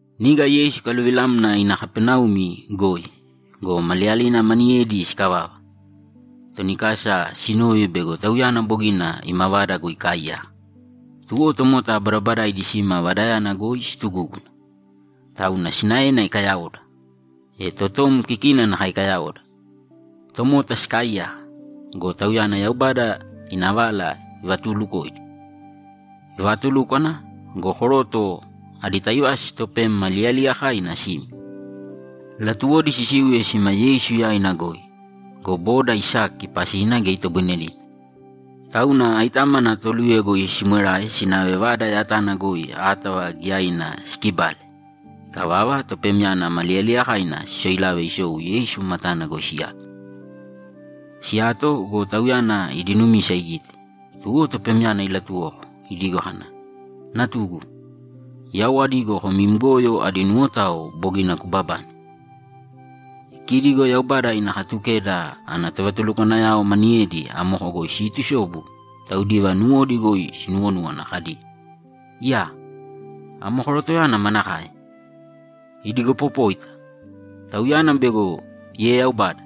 Niga Yeisu ikaluvilamna ina Kapaneumi goi go, maliyalina maniyedi sikavava, toni kasa sinove bego Tauyana bogina ima vada goi ikaaiyaka. Tuwo tomota badabadaidi sima vadayana goi situgúguna, tauna sinaena ikayaoda, e totom kikina nakae ikayaoda. Tomota sikaaiyaka go, Tauyana Yaubada ina vala ivatuulukoidi. Ivaatulúkwana go, koroto adi taivasi topem ma liyaliyakaina sime. Latuwodi sisiuye sime Yeisu yaina goi go, boda isaki pasina geya itoboinedita. Tauna aitámana toluye goi simwerae sinave vada yatana goi átava giyaina sikibale. Ikavava, topemyana ma liyaliyakaina sisoilave isou Yeisu matana goi siyato. Siyato go, Tauyana idi numisa igite, tuwo topemyana ilatuwoko idigo kana, ‘Natugu, yau adigo kom im goyo adi nuwotao bogina kubabane.’ E kidi go Yaubada ina Katukeda ana tovatulukwanayao maniyedi amoko goi siitusobu taudiva nuwodi goi sinuwonúwana kadi, ‘Iyaa! Amo korotoyana manakae! Idigopopóita! Tauyana bego ieyaubada!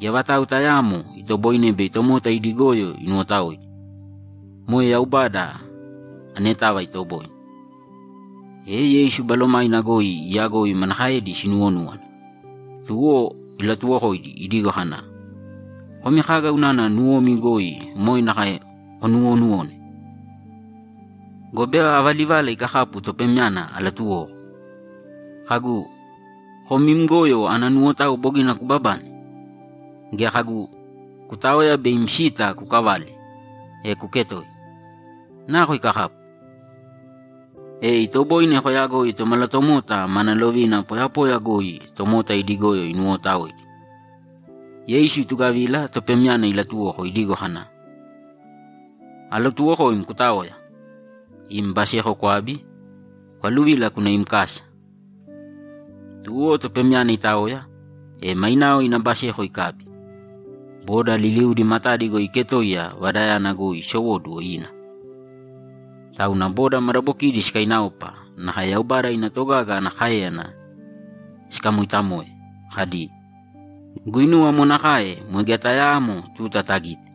Geya vatau tayaamo itoboine bei tomota idi goyo inuwotaoidi. Moe Yaubada anetava itoboine.’ E Yeisu balomaina goi iyagoi manakaedi sinuwonúwana, tuwo ilatuwokoidi idigo kana, ‘Komi kaga unana nuwomi goi moe nakae konuwonuwone? Gobe ava livala ikakapu topemyana alatuwoko? Kagu, “Kom im goyo ana nuwotao bogina kubabane”? Gea kagu, “Kutāoya be im sita kukavāle, e kuketōiya”? Nako ikakapu? E itoboine koyagoi Tomalatomota mana lovina poyapoya goi tomota idi goyo inuwootaoidi.’ Yeisu itugavila topemyana ilatuwoko idigo kana, ‘Alatuwokoim kutāoya, im baseko kwābi, kwaluvīla kūna im kasa!’ Tuwo topemyana itaoya, e mainao ina baseko ikabi, boda liliudi matadi goi iketoiya vadayana goi isowóduwo ina! Tauna boda madabokidi sikainaopa nakae Yaubada ina togaga ana káeyana sikamoitamoe kadi, ‘Guinuwa amo nakae boi geya tayaamo tuta tagite!’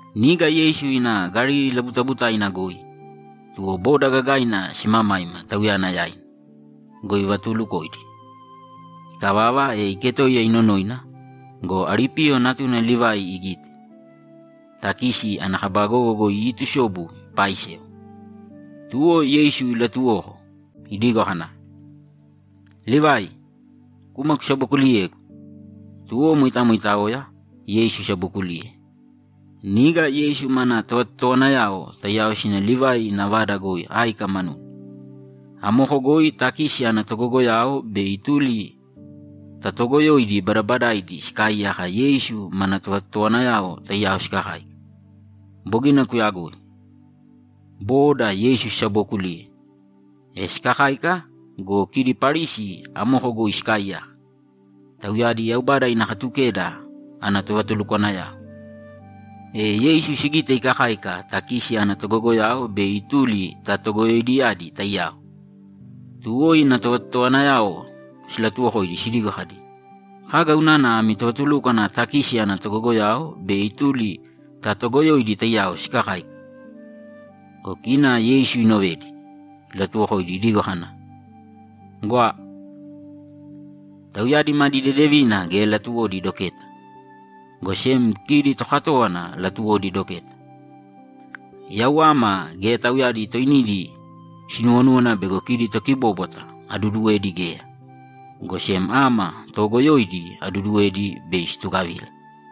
Niga Yeisu ina Galili labutabutaina goi, tuwo boda gagaina simamaima Tauyana yaina go, ivatuulukoidi. Ikavava, iketoiya inonoina go, Alipiyo natuna Livai igite, takisi ana kaba gogo goi iitusobu ipaaisewa. Tuwo Yeisu ilatuwoko idigo kana, ‘Livai, kūma kusabokuliyēgu!’ Tuwo moitamo itaoya, Yeisu isabokuliye. Niga Yeisu mana tovatotowanayao taiyao sina Livai ina vada goi áika manuna. Amoko goi takisi ana togogoyao be ituli ta toogoyoidi badabadaidi sikaaiyaka Yeisu mana tovatotowanayao taiyao sikakáika. Bogina kuyagoi. Booda Yeisu sisabookuliye. E sikakáika go, kidi Parisi amoko goi sikaaiyaka, tauyadi Yaubada ina Katukeda ana tovatulukwanayao. E Yeisu sigite ikakáika takisi ana togogoyao be ituli ta togoyoidiyadi taiyao. Tuwo ina tovatotowanayao silatuwokoidi sidigo kadi, ‘Kaga unana ami tovatulúkwana takisi ana togogoyao be ituli ta toogoyoidi taiyao sikakáika?’ Go kina Yeisu inovedi, ilatuwokoidi idigo kana, ‘Gwa. Tauyadi madi deedevina geya latuwodi doketa, go sem kidi tokatówana latuwodi doketa. Yau ama geya tauyadi toinidi sinuwonúwana bego kidi tokibóbwata aduduwedi geya, go sem ama toogoyoidi aduduwedi bei situgavila.’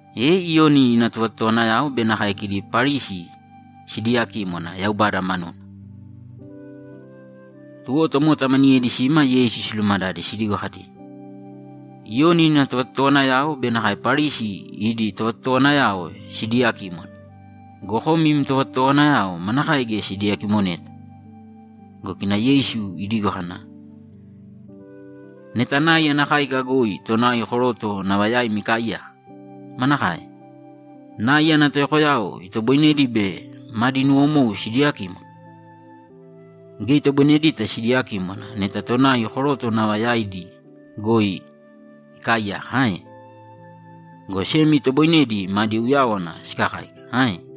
E Iyoni ina tovatotowanayao be nakae kidi Parisi sidiiyakímwana Yaubada manuna. Tuwo tomota maniyedi sima Yeisu silumadade sidigo kadi, ‘Iyoni ina tovatotowanayao be nakae Parisi idi tovatotowanayao sidiiyakímwana go, kom im tovatotowanayao manakae geya sidiyakimoneta?’ Go kina Yeisu idigo kana, ‘Neta nai ana káika goi tonai koroto nava yaimi ikaaiyaka, manakae? Nai ana toyokoyao itoboinedi bei madi nuwomou sidiyakímwana? Geya itoboinedita sidiyakímwana neta tonai koroto nava yaidi goi ikaaiyaka ae? Go sem itoboinedi madi uyáwana sikakáika ae?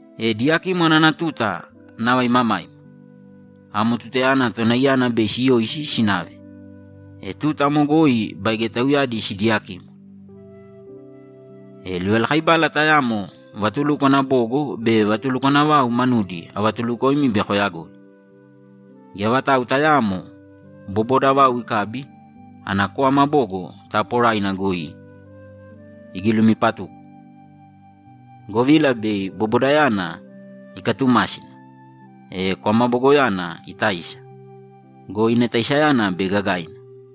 E diyakímwana ana tuta nava imamaima. Amo tutayana tonaiyana bei siyoisi sinave, e tuta amo goi baige tauyadi sidiyakímwana. E livalakaibala tayamo vatulukwana bogo be vatulukwana vau manudi avatulukoimi bei koyagoi. Geya vatau tayaamo boboda vau ikabi, ana kwama bogo taaporaina goi igilumipatuko, govila bei bobodayana ikatumásina, e kwama bogoyana itaisa go, ina taisayana bei gagaina.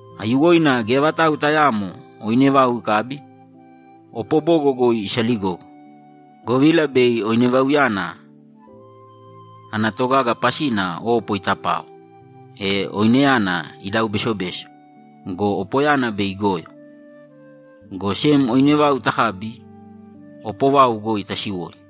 Aiyuwoina geya vatau tayaamo oine vau ikabi, opo bogo goi isaligogo, govila bei oine vauyana ana togaga pasina opo itapao, e oineyana idau besobeso go, opoyana bei igoyo. Go sem oine vau takabi, opo vau goi tasiwoi.’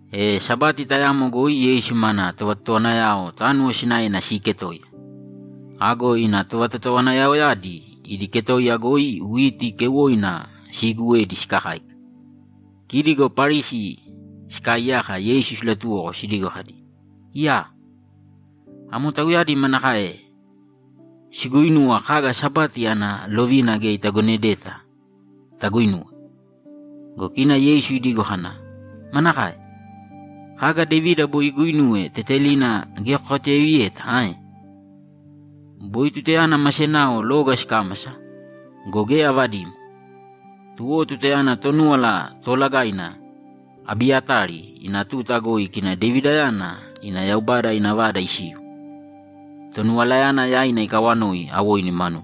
E Sabati tayamo goi Yeisu mana tovatotowanayao tánuwo sinaena siiketoiya. Ago ina tovatotowanayaoyadi idi ketoiya goi witi keuwoina siiguwedi sikakáika. Kidi go Parisi sikaaiyaka Yeisu silatuwoko sidigo kadi, ‘Iyaa! Amo tauyadi manakae siguuinuwa kaga Sabati ana lovina geya itagonedeta taguinuwe?’ Go kina Yeisu idigo kana, ‘Manakae? Kaga Devida boi iguuinuwe tetelina geya kokatuyaiviyeta ae? Boi tutayana ma senao loga sikámasa go, geya avadimo. Tuwo tutayana Tonúwala Toolagaina Abiyatari ina tuta goi kina Devidayana ina Yaubada ina Vada isiu, Tonuwalayana yaina ikawanoi awoinu manuna.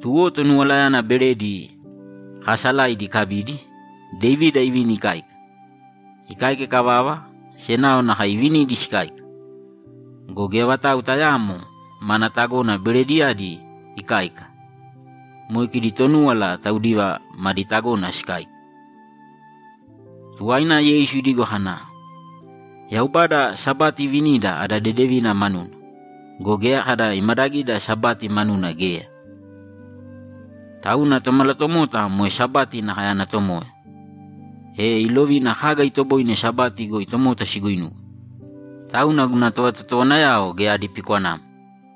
Tuwo Tonuwalayana beredi kaasalaidi ikabidi, Devida ivini ikáika. Ikáika ikavava, senao nakae ivinidi sikáika. Go geya vatau tayaamo mana tagona berediyadi ikáika. Moe kidi Tonúwala taudiva madi tagona sikáika.’ Tuwaina Yeisu idigo kana, ‘Yaubada Sabati ivinida ada dedevina manuna go, geya kada imadagida Sabati manuna geya. Tauna Tomalatomota moe Sabati nakae ana Tomoya, e ilovina kaga itoboine Sabati goi tomota siguinuwe, tauna guna tovatotowanayao geya adi pikwanamo.’